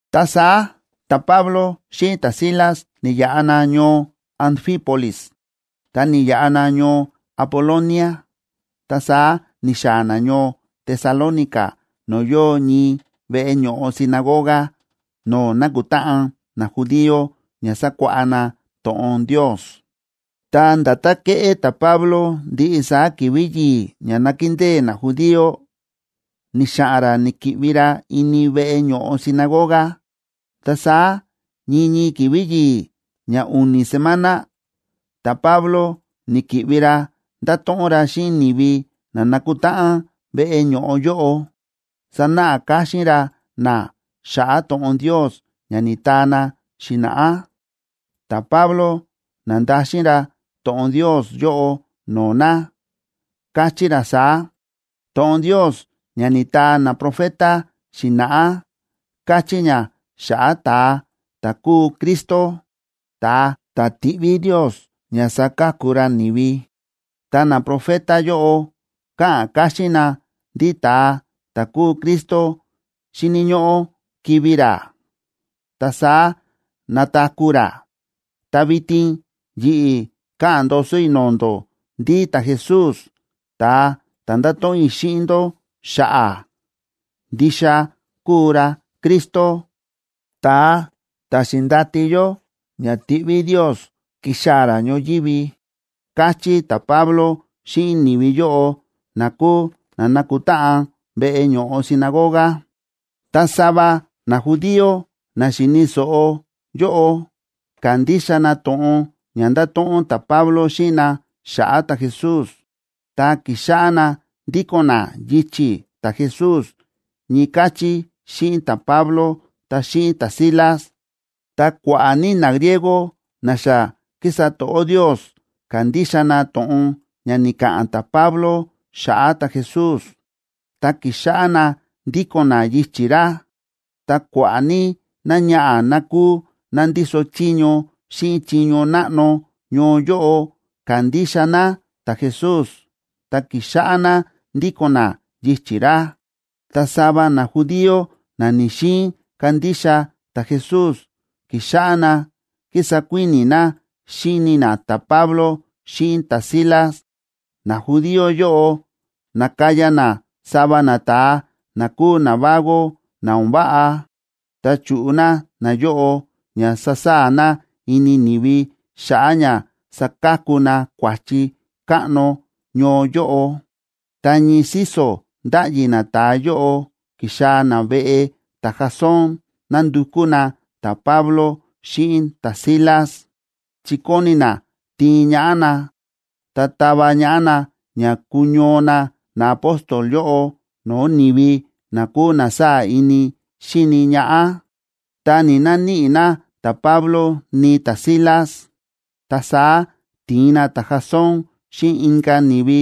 Ta saá ta̱Pablo xíꞌin ta̱Silas ni̱yaꞌa na ñoo Anfípolis ta ni̱yaꞌa na ñoo Apolonia, ta saá ni̱xaa̱ na ñoo Tesalónica no̱o̱ yóo ñii veꞌe ño̱ꞌo sinagoga no̱o̱ nákutáꞌan najudío ña sakuáꞌá na to̱ꞌon Ndios. Ta nda̱tán kéꞌé ta̱Pablo ndiꞌi saá ki̱vi̱ yi̱i̱ ña nákindée najudío, ni̱xa̱ꞌa̱n ra ni̱ki̱ꞌvi ra ini veꞌe ño̱ꞌo sinagoga. Ta saá ñii ñii ki̱vi̱ yi̱i̱ ña u̱ni̱ semana, ta̱Pablo ni̱ki̱ꞌvi ra nda̱to̱ꞌon ra xíꞌin ni̱vi na na̱kutáꞌan veꞌe ño̱ꞌo yóꞌo, sa̱náꞌa káxín ra na xa̱ꞌa̱ to̱ꞌon Ndios ña ni̱taa na xi̱na̱ꞌá. Ta̱Pablo na̱ndaxin ra to̱ꞌon Ndios yóꞌo no̱o̱ na, káchí ra saá: ―To̱ꞌon Ndios ña ni̱taa naprofeta xi̱na̱ꞌá, káchí ña xa̱ꞌa̱ ta̱a ta̱ kúu Cristo, ta̱a ta̱ tiꞌví Ndios ña saka̱ku ra ni̱vi. Ta naprofeta yóꞌo káꞌa̱n káxín na ndí ta̱a ta̱ kúu Cristo xíni̱ ñóꞌó kivi̱ ra, ta saá nataku̱ ra. Ta vitin yi̱ꞌi̱ káꞌa̱n ndoso i̱ no̱o̱ ndó ndí ta̱Jesús, ta̱a ta̱ ndáto̱ꞌon i̱ xíꞌin ndó xa̱ꞌa̱, ndixa kúu ra Cristo, ta̱a ta̱ xi̱ndati yó ña tiꞌví Ndios kixaa̱ ra ñoyívi ―káchí ta̱Pablo xíꞌin ni̱vi yóꞌo na kúu na nákutáꞌan veꞌe ño̱ꞌo sinagoga. Ta sava najudío na xíni̱ so̱ꞌo yóꞌo, ka̱ndixa na to̱ꞌon ña nda̱to̱ꞌon ta̱Pablo xíꞌin na xa̱ꞌa̱ ta̱Jesús, ta ki̱xáꞌá na ndíko̱n na yichi̱ ta̱Jesús ñii káchí xíꞌin ta̱Pablo ta xíꞌin ta̱Silas. Ta kua̱ꞌa̱ ní nagriego na xa kísa to̱ꞌó Ndios, ka̱ndixa na to̱ꞌon ña ni̱ka̱ꞌa̱n ta̱Pablo xa̱ꞌa̱ ta̱Jesús, ta ki̱xáꞌá na ndíko̱n na yichi̱ ra. Ta kua̱ꞌa̱ ní náñaꞌa̱ ná kúu ná ndíso chiño xíꞌin chiño náꞌno ñoo yóꞌo, ka̱ndixa ná ta̱Jesús ta ki̱xáꞌá ná ndíko̱n ná yichi̱ ra. Ta sava najudío na ni̱‑xiin kandixa ta̱Jesús, ki̱xáꞌá na kísa kuíni̱ na xíni na ta̱Pablo xíꞌin ta̱Silas. Najudío yóꞌo na̱kaya na sava nata̱a na kúu navago na o̱n váꞌa, ta chu̱ꞌu na nayóꞌo ña sasaa̱ na ini ni̱vi xa̱ꞌa̱ ña sakaku na kua̱chi káꞌno ñoo yóꞌo. Ta ñii síso̱ ndáꞌyi nata̱a yóꞌo ki̱xaa̱ na veꞌe ta̱Jasón nándukú na ta̱Pablo xíꞌin ta̱Silas, chi kóni na tiin ñaꞌá na ta tava ñaꞌá na ña kuñoo na naapóstol yóꞌo no̱o̱ ni̱vi na kúu na sáa̱ ini xíni ñaꞌá. Ta ni̱‑naníꞌi na ta̱Pablo ni ta̱Silas, ta saá ti̱in na ta̱Jasón xíꞌin inka̱ ni̱vi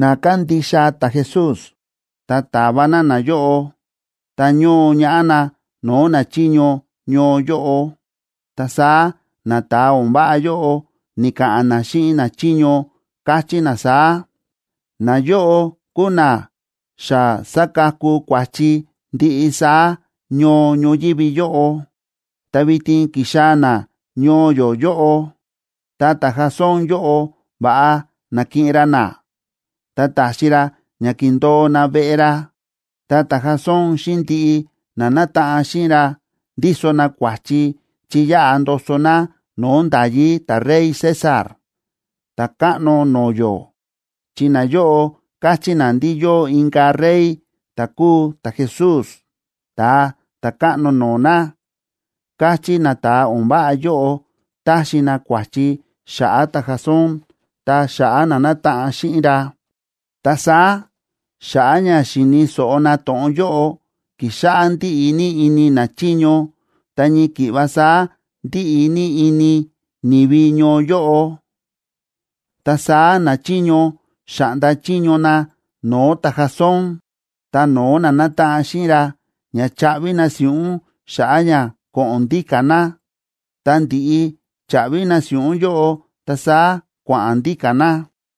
na kándixa ta̱Jesús, ta ta̱va na nayóꞌo, ta ño̱o ñaꞌá na no̱o̱ nachiño ñoo yóꞌo. Ta saá nata̱a o̱n váꞌa yóꞌo ni̱ka̱ꞌa̱n na xíꞌin nachiño, káchí na saá: ―Nayóꞌo kúu na xa sa̱kaku kua̱chi ndiꞌi saá ñoo ñoyívi yóꞌo. Ta vitin ki̱xaa̱ na ñoo yó yóꞌo. Ta ta̱Jasón yóꞌo va̱ꞌa na̱kiꞌin ra na, ta ta̱xi ra ña kíndo̱o na veꞌe ra. Ta ta̱Jasón xíꞌin ndiꞌi na nátaꞌan xíꞌin ra ndíso na kua̱chi chi yáꞌa ndoso na no̱o̱ nda̱yí ta̱rey César, ta̱káꞌno no̱o̱ yó, chi nayóꞌo káchí na ndí yóo inka̱ rey ta̱ kúu ta̱Jesús, ta̱a ta̱káꞌno no̱o̱ na ―káchí nata̱a o̱n váꞌa yóꞌo, táxi na kua̱chi xa̱ꞌa̱ ta̱Jasón ta xa̱ꞌa̱ na nátaꞌan xíꞌin ra. Ta saá, xa̱ꞌa̱ ña xi̱ni̱ so̱ꞌo na to̱ꞌon yóꞌo, ki̱xáꞌá ndíꞌi ní ini nachiño ta ñii ki̱ꞌva saá ndíꞌi ní ini ni̱vi ñoo yóꞌo. Ta saá nachiño xa̱ꞌnda chiño na no̱o̱ ta̱Jasón ta no̱o̱ na nátaꞌan xíꞌin ra, ña chaꞌvi na si̱ꞌún xa̱ꞌa̱ ña ko̱ꞌo̱n ndíka̱ na. Ta ndi̱ꞌi cha̱ꞌvi na si̱ꞌún yóꞌo, ta saá kua̱ꞌa̱n ndíka̱ na.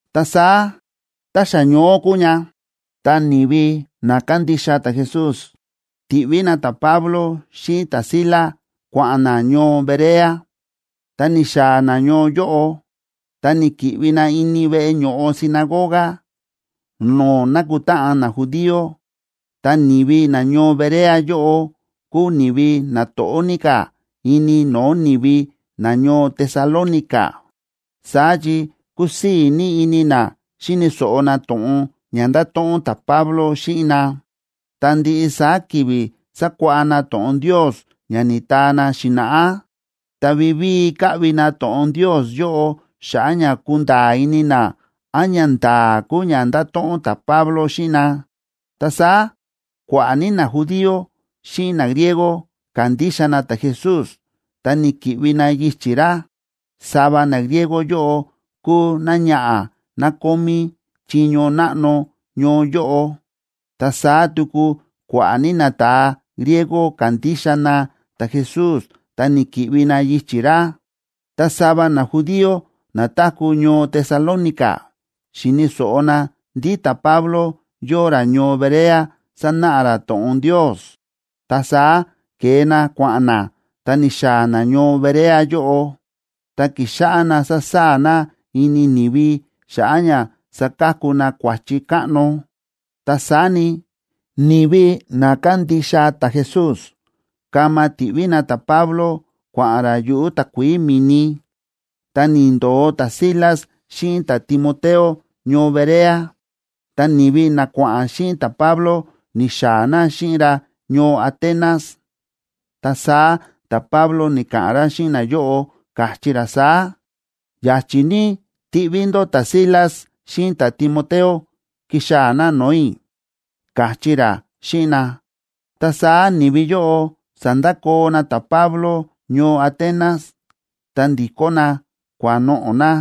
Ta saá ta xa ñoó kúu ña, ta ni̱vi na kándixa ta̱Jesús ti̱ꞌví na ta̱Pablo xíꞌin ta̱Silas kua̱ꞌa̱n na ñoo Berea. Tá ni̱xaa̱ na ñoo yóꞌo, ta ni̱ki̱ꞌvi na ini veꞌe ño̱ꞌo sinagoga no̱o̱ nákutáꞌan najudío. Ta ni̱vi nañoo Berea yóꞌo kúu ni̱vi na to̱ꞌó ní ka̱ ini no̱o̱ ni̱vi nañoo Tesalónica. Saá chi kúsii̱ ní ini na xi̱ni̱ so̱ꞌo na to̱ꞌon ña nda̱to̱ꞌon ta̱Pablo xíꞌin na. Ta ndiꞌi saá ki̱vi̱ sákuáꞌá na to̱ꞌon Ndios ña ni̱taa na xi̱na̱ꞌá, ta vivíi káꞌvi na to̱ꞌon Ndios yóꞌo xa̱ꞌa̱ ña kunda̱a̱ ini na án ñanda̱a̱ kúu ña nda̱to̱ꞌon ta̱Pablo xíꞌin na. Ta saá kua̱ꞌa̱ ní najudío xíꞌin nagriego ka̱ndixa na ta̱Jesús, ta ni̱ki̱ꞌvi na yichi̱ ra. Sava nagriego yóꞌo kúu náñaꞌa̱ ná kómí chiño náꞌno ñoo yóꞌo, ta saá tuku kua̱ꞌa̱ ní nata̱a griego ka̱ndixa na ta̱Jesús ta ni̱ki̱ꞌvi na yichi̱ ra. Ta sava najudío na táku̱ ñoo Tesalónica xi̱ni̱ so̱ꞌo na ndí ta̱Pablo yóo ra ñoo Berea sánáꞌa ra to̱ꞌon Ndios. Ta saá ke̱e na kua̱ꞌa̱n na, ta ni̱xaa̱ na ñoo Berea yóꞌo, ta ki̱xáꞌá na sásaa̱ na ini ni̱vi, xa̱ꞌa̱ ña sa̱kaku na kua̱chi káꞌno. Ta saá ni, ni̱vi na kándixa ta̱Jesús kama ti̱ꞌví na ta̱Pablo kua̱ꞌa̱n ra yuꞌu̱ takuií mi̱ni. Ta ni̱ndo̱o ta̱Silas xíꞌin ta̱Timoteo ñoo Berea. Ta ni̱vi na kua̱ꞌa̱n xíꞌin ta̱Pablo, ni̱xaa̱ na xíꞌin ra ñoo Atenas. Ta saá ta̱Pablo ni̱ka̱ꞌa̱n ra xíꞌin nayóꞌo, káchí ra saá: ―Ya̱chi̱ ní tiꞌví ndó ta̱Silas xíꞌin ta̱Timoteo kixaa̱ na no̱o̱ i̱ ―káchí ra xíꞌin na. Ta saá ni̱vi yóꞌo sa̱ndakoo na ta̱Pablo ñoo Atenas, ta ndi̱kó na kua̱noꞌo̱ na.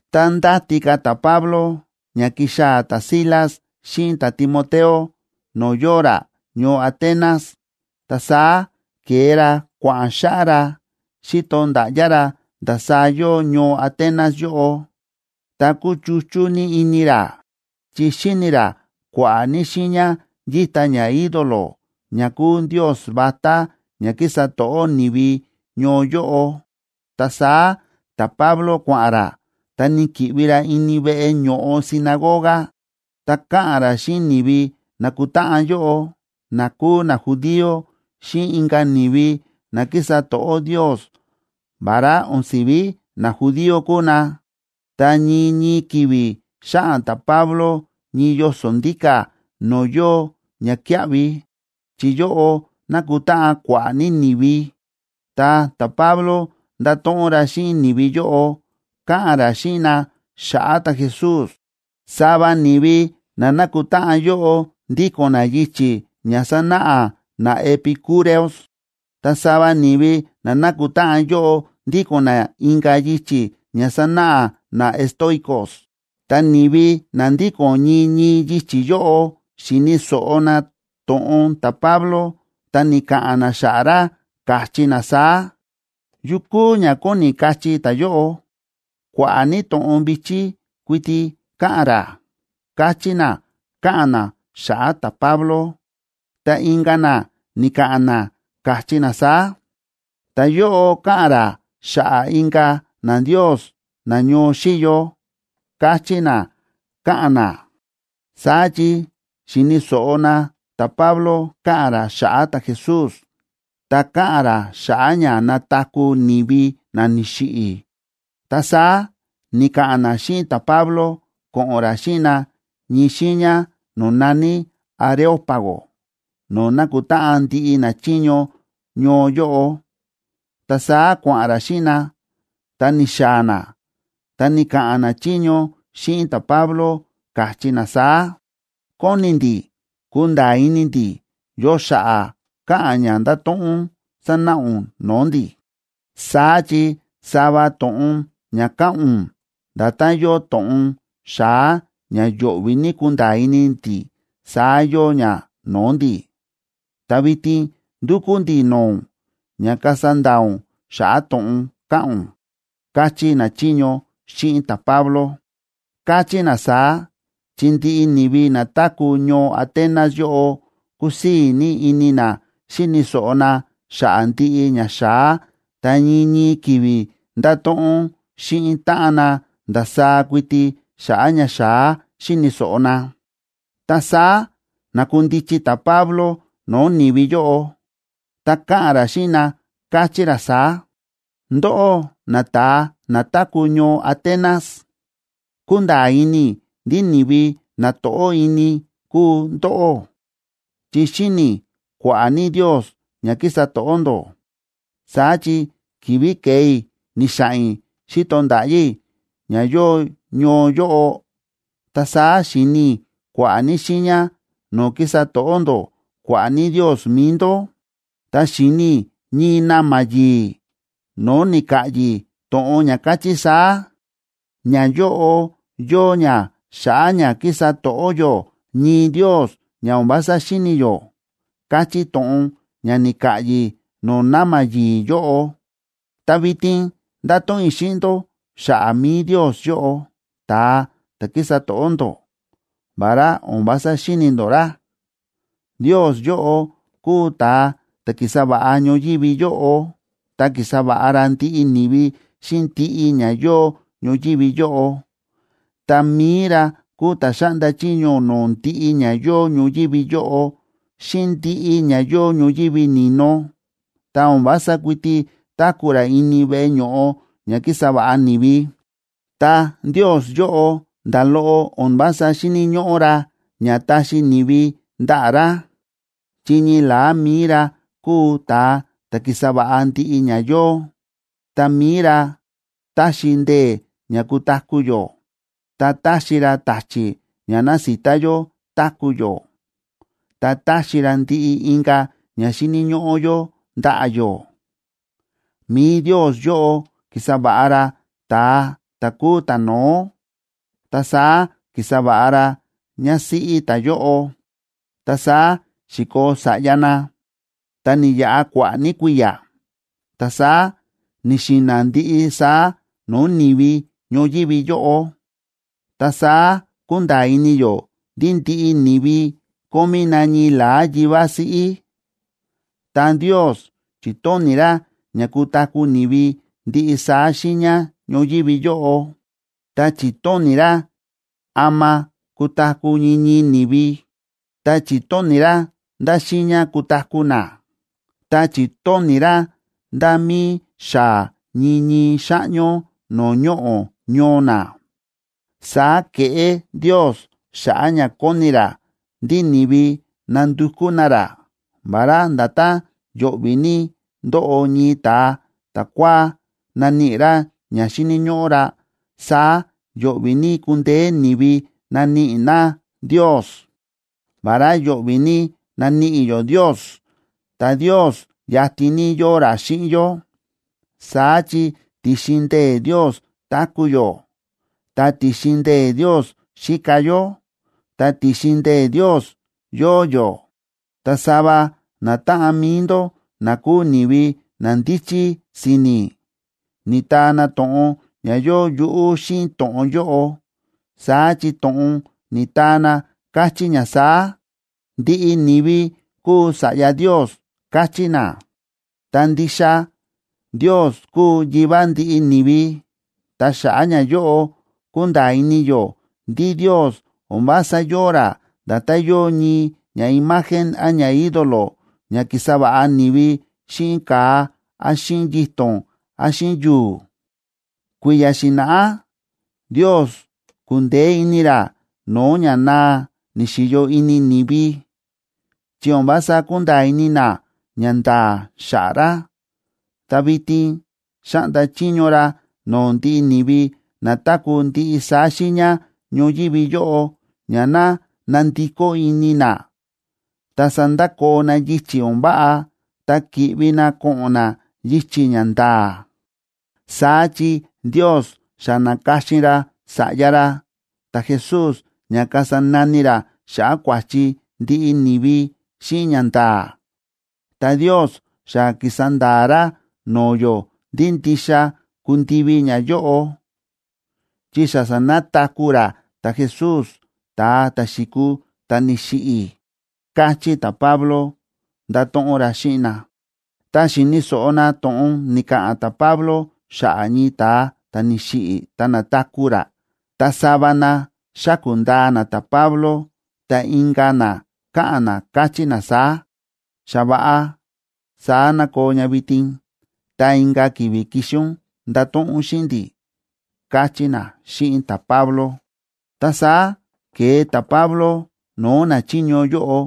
Tá ndáti ka̱ ta̱Pablo ña kixaa̱ ta̱Silas xíꞌin ta̱Timoteo no̱o̱ yóo ra ñoo Atenas, ta saá ke̱e ra kua̱ꞌa̱n xáꞌá ra, xíto nda̱ꞌyá ra ndasaá yóo ñoo Atenas yóꞌo, ta kúchuchú ní ini ra, chi xi̱ni ra kua̱ꞌa̱ ní xiiña yíta ñaídolo, ña kúu ndios vatá ña kísa to̱ꞌó ni̱vi ñoo yóꞌo. Ta saá ta̱Pablo kua̱ꞌa̱n ra, ta ni̱ki̱ꞌvi ra ini veꞌe ño̱ꞌo sinagoga, ta káꞌa̱n ra xíꞌin ni̱vi na̱kutáꞌan yóꞌo, na kúu najudío xíꞌin inka̱ ni̱vi na kísa to̱ꞌó Ndios vará o̱n si̱ví najudío kúu na. Ta ñii ñii ki̱vi̱ xáꞌa̱n ta̱Pablo ñii yoso̱ ndíka̱ no̱o̱ yóo ñakíaꞌvi, chi yóꞌo nákutáꞌan kua̱ꞌa̱ ní ni̱vi, ta ta̱Pablo nda̱to̱ꞌon ra xíꞌin ni̱vi yóꞌo, káꞌa̱n ra xíꞌin na xa̱ꞌa̱ ta̱Jesús. Sava ni̱vi na na̱kutáꞌan yóꞌo ndíko̱n na yichi̱ ña sánáꞌa naepicúreos, ta sava ni̱vi na na̱kutáꞌan yóꞌo ndíko̱n na inka̱ yichi̱ ña sánáꞌa naestoicos.a Ta ni̱vi na ndíko̱n ñii ñii yichi̱ yóꞌo xi̱ni̱ so̱ꞌo na to̱ꞌon ta̱Pablo, ta ni̱ka̱ꞌa̱n na xa̱ꞌa̱ ra, káchí na saá: ―¿Yu kúu ña kóni kachí ta̱yóꞌo? Kua̱ꞌa̱ ní to̱ꞌon vi̱chí kuiti káꞌa̱n ra ―káchí na, káꞌa̱n na xa̱ꞌa̱ ta̱Pablo. Ta inka̱ na ni̱ka̱ꞌa̱n na, káchí na saá: ―Ta̱yóꞌo káꞌa̱n ra xa̱ꞌa̱ inka̱ nandios na ñoo xíyo ―káchí na, káꞌa̱n na. Saá chi xi̱ni̱ so̱ꞌo na ta̱Pablo káꞌa̱n ra xa̱ꞌa̱ ta̱Jesús, ta káꞌa̱n ra xa̱ꞌa̱ ña nataku̱ ni̱vi na ni̱xiꞌi̱. Ta saá ni̱ka̱ꞌa̱n na xíꞌin ta̱Pablo ko̱ꞌo̱n ra xíꞌin na ñii xiiña no̱o̱ na̱ní Areópago no̱o̱ nákutáꞌan ndiꞌi nachiño ñoo yóꞌo. Ta saá kua̱ꞌa̱n ra xíꞌin na, ta ni̱xaa̱ na. Ta ni̱ka̱ꞌa̱n nachiño xíꞌin ta̱Pablo, káchí na saá: ―Kóni ndi̱ kunda̱a̱ ini ndi̱ yo xa̱ꞌa̱ káꞌa̱n ña ndáto̱ꞌon ún sánáꞌa ún no̱o̱ ndi̱. Saá chi sava to̱ꞌon ña káꞌa̱n ún nda̱tán yóo to̱ꞌon xa̱á ña yo̱ꞌvi̱ ní kunda̱a̱ ini ndi̱, saá yóo ña no̱o̱ ndi̱. Ta vitin ndúkú ndi̱ no̱o̱ ún, ña kasa nda̱a̱ ún xa̱ꞌa̱ to̱ꞌon káꞌa̱n ún ―káchí nachiño xíꞌin ta̱Pablo. (Káchí na saá, chi ndiꞌi ni̱vi na táku̱ ñoo Atenas yóꞌo kúsii̱ ní ini na xíni̱ so̱ꞌo na xa̱ꞌa̱ ndiꞌi ña xa̱á, ta ñii ñii ki̱vi̱ ndáto̱ꞌon xíꞌin táꞌan na ndasaá kuiti xa̱ꞌa̱ ña xa̱á xíni̱ so̱ꞌo na.) Ta saá na̱kundichi ta̱Pablo no̱o̱ ni̱vi yóꞌo, ta káꞌa̱n ra xíꞌin na, káchí ra saá: ―Ndóꞌó nata̱a na táku̱ ñoo Atenas, kúnda̱a̱ ini i̱ ndí ni̱vi na to̱ꞌó ini kúu ndóꞌó, chi xi̱ni i̱ kua̱ꞌa̱ ní ndios ña kísa to̱ꞌó ndó. Saá chi ki̱vi̱ ke̱e i̱ ni̱xa̱ꞌa̱n i̱ xi̱to nda̱ꞌyá i̱ ña yóo ñoo yóꞌo, ta saá xi̱ni i̱ kua̱ꞌa̱ ní xiiña no̱o̱ kísa to̱ꞌó ndó kua̱ꞌa̱ ní ndios mi̱i ndó. Ta xi̱ni i̱ ñii na̱ma̱ yi̱i̱ no̱o̱ ni̱ka̱ꞌyi̱ to̱ꞌon ña káchí saá: “Ñayóꞌo yóo ña xa̱ꞌa̱ ña kísa to̱ꞌó yó ñii Ndios ña o̱n vása xíni̱ yó”, káchí to̱ꞌon ña ni̱ka̱ꞌyi̱ no̱o̱ na̱ma̱ yi̱i̱ yóꞌo. Ta vitin ndáto̱ꞌon i̱ xíꞌin ndó xa̱ꞌa̱ mi̱i Ndios yóꞌo, ta̱a ta̱ kísa to̱ꞌó ndó, vará o̱n vása xíni̱ ndó ra. ’Ndios yóꞌo kúu ta̱a ta̱ ki̱sa va̱ꞌa ñoyívi yóꞌo ta ki̱sa va̱ꞌa ra ndiꞌi ni̱vi xíꞌin ndiꞌi ña yóo ñoyívi yóꞌo. Ta mi̱i ra kúu ta̱ xáꞌnda chiño no̱o̱ ndiꞌi ña yóo ñoyívi yóꞌo xíꞌin ndiꞌi ña yóo ñoyívi ni̱no, ta o̱n vása kuiti táku̱ ra ini veꞌe ño̱ꞌo ña ki̱sa va̱ꞌa ni̱vi. Ta Ndios yóꞌo nda̱ loꞌo o̱n vása xíni̱ ñóꞌó ra ña taxi ni̱vi ndaꞌa̱ ra, chi ñii la̱á mi̱i ra kúu ta̱a ta̱ ki̱sa va̱ꞌa ndiꞌi ña yóo. Ta mi̱i ra táxi ndee̱ ña kutaku̱ yó, ta táxi ra ta̱chi̱ ña násita yó táku̱ yó, ta táxi ra ndiꞌi inka̱ ña xíni̱ ñóꞌó yó ndaꞌa̱ yó. ’Mi̱i Ndios yóꞌo ki̱sa va̱ꞌa ra ta̱a ta̱ kúu ta̱no̱ó ta saá ki̱sa va̱ꞌa ra ñásíꞌí ta̱yóꞌo, ta saá xi̱koo sa̱ꞌya na, ta ni̱yaꞌa kua̱ꞌa̱ ní kui̱ya̱, ta saá ni̱xi̱na̱ ndiꞌi saá no̱o̱ ni̱vi ñoyívi yóꞌo. Ta saá kúnda̱a̱ ini yó ndí ndiꞌi ni̱vi kómí na ñii la̱á yivá siꞌí. Ta Ndios chi̱tóni̱ ra ña kutaku̱ ni̱vi ndiꞌi saá xiiña ñoyívi yóꞌo, ta chi̱tóni̱ ra ama kutaku̱ ñii ñii ni̱vi, ta chi̱tóni̱ ra ndá xiiña kutaku̱ na, ta chi̱tóni̱ ra nda̱ mí xaa̱ ñii ñii xáꞌñó no̱o̱ ñoꞌo̱ ñoo na. Saá ke̱ꞌé Ndios xa̱ꞌa̱ ña kóni ra ndí ni̱vi nandukú na ra, vará nda̱tán yo̱ꞌvi̱ ní ndóꞌo ñii ta̱a ta̱kua̱á naníꞌi ra ña xíni̱ ñóꞌó ra, saá yo̱ꞌvi̱ ní kundeé ni̱vi naníꞌi na Ndios. Vará yo̱ꞌvi̱ ní naníꞌi yó Ndios, ta Ndios yatin ní yóo ra xíꞌin yó. Saá chi ti̱xin ndee̱ Ndios táku̱ yó, ta ti̱xin ndee̱ Ndios xíka yó, ta ti̱xin ndee̱ Ndios yóo yó. Ta sava natáꞌan mi̱i ndó, na kúu ni̱vi na ndíchí si̱ni̱, ni̱taa na to̱ꞌon ña yóo yuꞌú xíꞌin to̱ꞌon yóꞌo, saá chi to̱ꞌon ni̱taa na káchí ña saá: “Ndiꞌi ni̱vi kúu sa̱ꞌya Ndios”, káchí na. Ta ndixa Ndios kúu Yivá ndiꞌi ni̱vi. Ta xa̱ꞌa̱ ñayóꞌo kúnda̱a̱ ini yó ndí Ndios o̱n vása yóo ra nda̱tán yóo ñii ñaimagen án ñaídolo ña kísa va̱ꞌa ni̱vi xíꞌin ka̱a án xíꞌin yito̱n án xíꞌin yu̱u̱. Kui̱ya̱ xi̱na̱ꞌá Ndios ku̱ndeé ini ra no̱o̱ ña naa ni̱xi̱yo ini ni̱vi, chi o̱n vása kúnda̱a̱ ini na ñanda̱a̱ xa̱ꞌa̱ ra. Ta vitin xáꞌnda chiño ra no̱o̱ ndiꞌi ni̱vi na táku̱ ndiꞌi saá xiiña ñoyívi yóꞌo ña ná nandikó ini na ta sandakoo na yichi̱ o̱n váꞌa ta ki̱ꞌvi na ko̱ꞌo̱n na yichi̱ ña nda̱a̱. Saá chi Ndios xa na̱ka̱xin ra Sa̱ꞌya ra ta̱Jesús ña kasa nani ra xa̱ꞌa̱ kua̱chi ndiꞌi ni̱vi xíꞌin ñanda̱a̱. Ta Ndios xa ki̱sa nda̱a̱ ra no̱o̱ yó ndí ndixa kundivi ñayóꞌo, chi xa sa̱nataku̱ ra ta̱Jesús, ta̱a ta̱ xi̱kuu ta̱ni̱xiꞌi̱ ―káchí ta̱Pablo, ndáto̱ꞌon ra xíꞌin na. Tá xi̱ni̱ so̱ꞌo na to̱ꞌon ni̱ka̱ꞌa̱n ta̱Pablo xa̱ꞌa̱ ñii ta̱a ta̱ ni̱xiꞌi̱ ta na̱taku̱ ra, ta sava na xáku̱ ndaa na ta̱Pablo, ta inka̱ na káꞌa̱n na, káchí na saá: ―Xa va̱ꞌa, saá ná koo ña vitin, ta inka̱ ki̱vi̱ kixi ún ndato̱ꞌon ún xíꞌin ndi̱ ―káchí na xíꞌin ta̱Pablo. Ta saá ke̱e ta̱Pablo no̱o̱ nachiño yóꞌo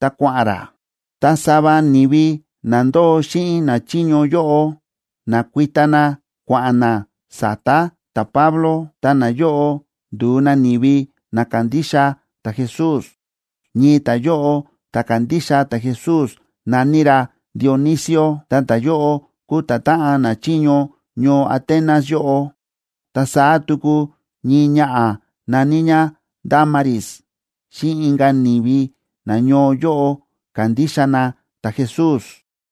ta kua̱ꞌa̱n ra. Ta sava ni̱vi na ndóo xíꞌin nachiño yóꞌo na̱kuita na kua̱ꞌa̱n na sa̱ta̱ ta̱Pablo, ta nayóꞌo ndu̱u na ni̱vi na kándixa ta̱Jesús. Ñii ta̱yóꞌo ta̱ ka̱ndixa ta̱Jesús na̱ní ra Dionisio, ta ta̱yóꞌo kúu ta̱táꞌan nachiño ñoo Atenas yóꞌo.b Ta saá tuku ñii ñaꞌa̱ na̱ní ñá Dámaris, xíꞌin inka̱ ni̱vi nañoo yóꞌo ka̱ndixa na ta̱Jesús.